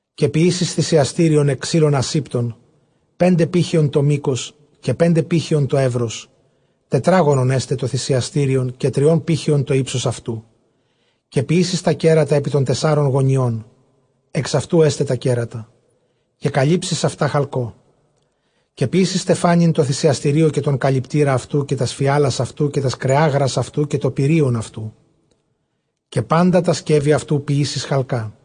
Καὶ ποιήσεις θυσιαστήριον ἐκ ξύλων ἀσήπτων, πέντε πήχεων τὸ μῆκος, καὶ πέντε πήχεων τὸ εὖρος· τετράγωνον ἔσται τὸ θυσιαστήριον, καὶ τριῶν πήχεων τὸ ὕψος αὐτοῦ. Καὶ ποιήσεις τὰ κέρατα ἐπὶ τῶν τεσσάρων γωνιῶν· ἐξ αὐτοῦ ἔσται τὰ κέρατα, καὶ καλύψεις αὐτὰ χαλκῷ. Καὶ ποιήσεις στεφάνην τῷ θυσιαστηρίῳ· καὶ τὸν καλυπτῆρα αὐτοῦ, καὶ τὰς φιάλας αὐτοῦ, καὶ τὰς κρεάγρας αὐτοῦ, καὶ τὸ πυρεῖον αὐτοῦ, καὶ πάντα τὰ σκεύη αὐτοῦ ποιήσεις χαλκᾶ.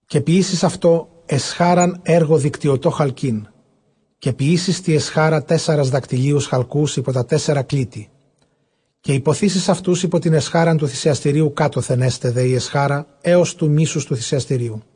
Καὶ ποιήσεις αὐτῷ ἐσχάραν ἔργῳ δικτυωτῷ χαλκῆν· καὶ ποιήσεις τῇ ἐσχάρᾳ τέσσαρες δακτυλίους χαλκοῦς ὑπὸ τὰ τέσσαρα κλίτη. Καὶ ὑποθήσεις αὐτοὺς ὑπὸ τὴν ἐσχάραν τοῦ θυσιαστήριου κάτωθεν· ἔσται δὲ ἡ ἐσχάρα ἕως τοῦ ἡμίσους τοῦ θυσιαστηρίου.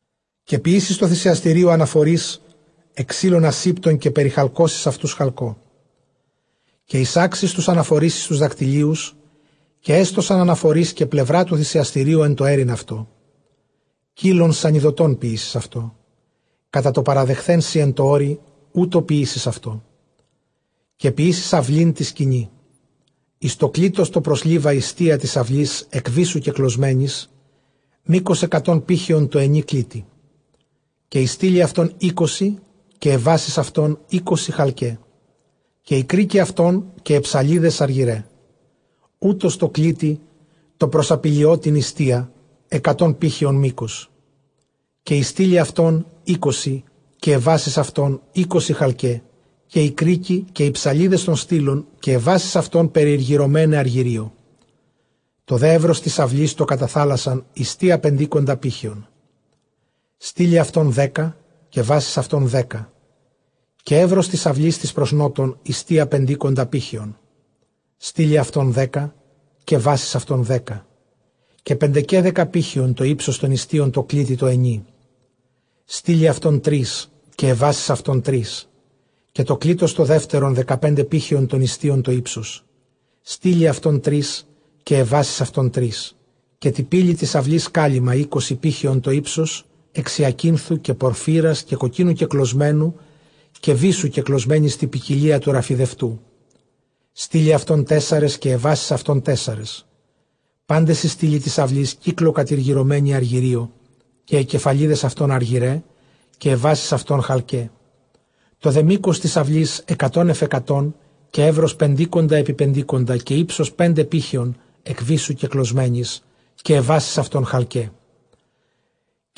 Καὶ ποιήσεις τῷ θυσιαστηρίῳ ἀναφορεῖς ἐκ ξύλων ἀσήπτων, καὶ περιχαλκώσεις αὐτοὺς χαλκῷ. Καὶ εἰσάξεις τοὺς ἀναφορεῖς εἰς τοὺς δακτυλίους· καὶ ἔστωσαν ἀναφορεῖς κατὰ πλευρὰ τοῦ θυσιαστηρίου ἐν τῷ αἴρειν αὐτό. Κοῖλον συνιδωτὸν ποιήσεις αὐτό· κατὰ τὸ παραδειχθέν σοι ἐν τῷ ὄρει, οὕτω ποιήσεις αὐτό. Καὶ ποιήσεις αὐλὴν τῇ σκηνῇ· εἰς τὸ κλίτος τὸ πρὸς Λίβα ἱστία τῆς αὐλῆς ἐκ βύσσου κεκλωσμένης· μῆκος ἑκατὸν πήχεων τῷ ἑνὶ κλίτει. Καὶ οἱ στύλοι αὐτῶν εἴκοσι, καὶ αἱ βάσεις αὐτῶν εἴκοσι χαλκαῖ, καὶ οἱ κρίκοι αὐτῶν καὶ αἱ ψαλίδες ἀργυραῖ. Οὕτως τῷ κλίτει τῷ πρὸς ἀπηλιώτην ἱστία ἑκατὸν πήχεων μῆκος· καὶ οἱ στύλοι αὐτῶν εἴκοσι, καὶ αἱ βάσεις αὐτῶν εἴκοσι χαλκαῖ· καὶ οἱ κρίκοι καὶ αἱ ψαλίδες τῶν στύλων, καὶ αἱ βάσεις αὐτῶν περιηργυρωμέναι ἀργυρίῳ. Τὸ δὲ εὖρος τῆς αὐλῆς τὸ κατὰ θάλασσαν ἱστία πεντήκοντα πήχεων· στύλοι αὐτῶν δέκα, καὶ βάσεις αὐτῶν δέκα. Καὶ εὖρος τῆς αὐλῆς τῆς πρὸς Νότον ἱστία πεντήκοντα πήχεων· στύλοι αὐτῶν δέκα, καὶ βάσεις αὐτῶν δέκα. Καὶ πεντεκαίδεκα πήχεων τὸ ὕψος τῶν ἱστίων τῷ κλίτει τῷ ἑνί· στύλοι αὐτῶν τρεῖς, καὶ αἱ βάσεις αὐτῶν τρεῖς. Καὶ τὸ κλίτος τὸ δεύτερον δεκαπέντε πήχεων τῶν ἱστίων τὸ ὕψος· στύλοι αὐτῶν τρεῖς, καὶ αἱ βάσεις αὐτῶν τρεῖς. Καὶ τῇ πύλῃ τῆς αὐλῆς κάλυμμα· εἴκοσι πήχεων τὸ ὕψος ἐξ ὑακίνθου, καὶ πορφύρας, καὶ κοκκίνου κεκλωσμένου, καὶ βύσσου κεκλωσμένης τῇ ποικιλίᾳ τοῦ ῥαφιδευτοῦ· στύλοι αὐτῶν τέσσαρες, καὶ αἱ βάσεις αὐτῶν τέσσαρες. Πάντες οἱ στύλοι τῆς αὐλῆς κύκλῳ κατηργυρωμένοι ἀργυρίῳ, καὶ αἱ κεφαλίδες αὐτῶν ἀργυραῖ, καὶ αἱ βάσεις αὐτῶν χαλκαῖ. Τὸ δὲ μῆκος τῆς αὐλῆς ἑκατὸν ἐφʼ ἑκατόν· καὶ εὖρος πεντήκοντα ἐπὶ πεντήκοντα· καὶ ὕψος πέντε πήχεῶν ἐκ βύσσου κεκλωσμένης, καὶ βάσεις αὐτῶν χαλκαῖ.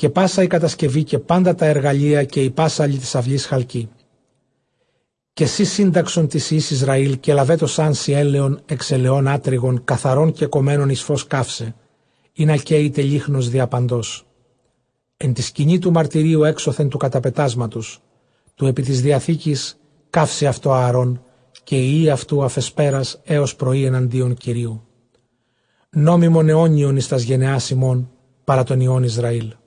Καὶ πᾶσα ἡ κατασκευὴ καὶ πάντα τὰ ἐργαλεῖα καὶ οἱ πάσσαλοι τῆς αὐλῆς χαλκοῖ. Καὶ σὺ σύνταξον τοῖς υἱοῖς Ἰσραὴλ, καὶ λαβέτωσάν σοι ἔλαιον ἐξ ἐλαιῶν ἀτρυγον καθαρὸν κεκομμένον εἰς φῶς καῦσαι, ἵνα καίηται λύχνος διαπαντός ἐν τῇ σκηνῇ τοῦ μαρτυρίου· ἔξωθεν τοῦ καταπετάσματος τοῦ ἐπὶ τῆς διαθήκης καύσει αὐτὸ Ἀαρὼν καὶ οἱ υἱοὶ αὐτοῦ ἀφʼ ἑσπέρας ἕως πρωῒ, ἐναντίον Κυρίου, νόμιμον αἰώνιον εἰς τὰς γενεὰς ὑμῶν παρὰ τῶν υἱῶν Ἰσραήλ.